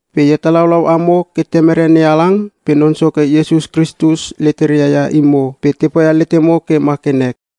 Pe e hetalaulau amo ke Temere NeHalang pe Non Soke Iesus Kristus leteria ia imo, pe te poia letemo ke ma ke nek.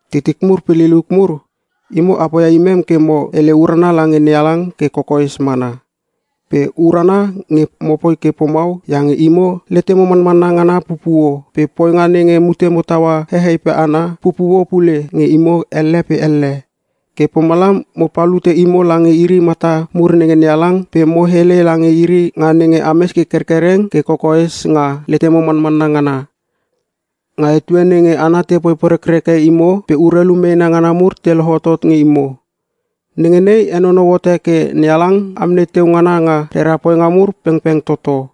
Titik mur pe liliuk mur, imo a poia imem ke mo hele urana lange NeHalang ke kokoes mana. Pe urana nge mopoi ke pomau iange imo letemo manmanna ngana pupuo, pe poinga nenge mutemo taua hehei pe hana, pupuo pule nge imo elle pe elle. Ke pomalam mo palute imo lange iri mata mur nenge NeHalang pe mo hele lange iri nga nenge ames ke kerkereng ke kokoes nga letemo manmanna ngana, nga etue nenge hana tepoi porekreke imo pe urelu meena ngana mur te lohotot nge imo. Nenge nei henonou hote ke NeHalang amnei teu ngana nga rera poinga mur pengpeng toto.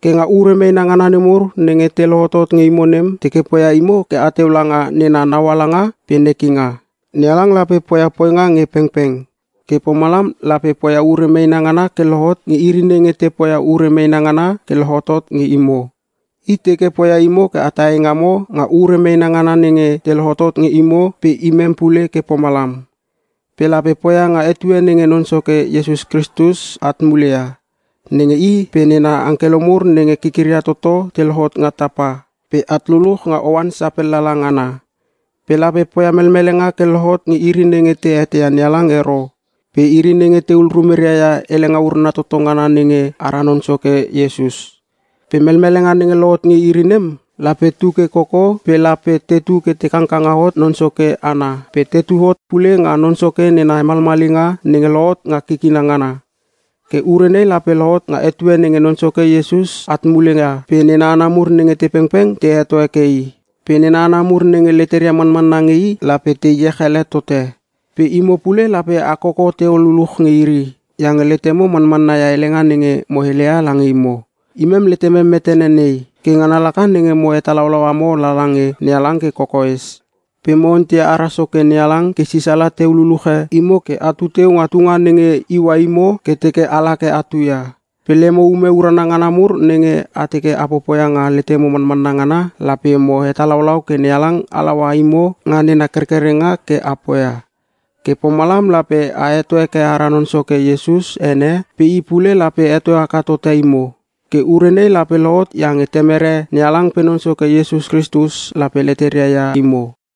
Ke nga ure meena ngana nemur nenge te lohotot nge imo nem, teke poia imo ke ateu langa nena naualanga pe nekinga. NeHalang lape poia poinga nge pengpeng, ke pomalam lape poia ure meena ngana ke lohot nge iri nenge te poia ure meena ngana ke lohotot nge imo. I teke poia imo ke ata eingamo nga ure meena ngana nenge te lohotot nge imo pe imem pule ke pomalam. Pe lape poia nga etue nenge Non Soke Iesus at mule ia, nenge I pe nena angkelo mur nenge kikiria toto te lohot nga tapa, pe at luluch nga oan sapellala ngana. Pe lape poia melmelenga ke lohot nge iri nenge te eteia NeHalang ero, pe iri nenge tehul rumeria ia helenga urana toto ngana nenge ara Non Soke Iesus. Pe melmelenga nenge lohot nge iri nem, lape tu ke koko pe lape tetu ke te kangkanga hot Non Soke ana pe tetu hot pule nga Non Soke nena hemalmalinga nenge lohot nga kikina ngana. Ke ure nei lape lohot nga etue nenge Non Soke Iesus at mule ia pe nena hana mur nenge te pengpeng te heto heke I. Pe nena hana mur nenge leteria manmanna nge i lape te iech ele tote. Pe imo pule lape a koko teu luluch nge iri, iange letemo manmanna ia helenga nenge mo heleia lange imo. Imem letemem metene nei, ke ngana laka nenge mo hetalaulau amo lala nge NeHalang ke kokoes. Pe mo onteia ara Soke NeHalang ke sisala teu luluche imo ke atu teu nga tunga nenge iua imo ke teke ala ke atu ia. Pe lemo ume urana ngana mur nenge a teke a popoia nga letemo manmanna ngana, lape mo hetalaulau ke NeHalang halaua imo nga nena kerkerenga ke a poia. Ke pomalam lape a heto heke ara Non Soke Iesus ene pe I pule lape heto haka tote imo. Ke ure nei lape lohot iange Temere NeHalang pe Non Soke Iesus Kristus lape leteria ia imo.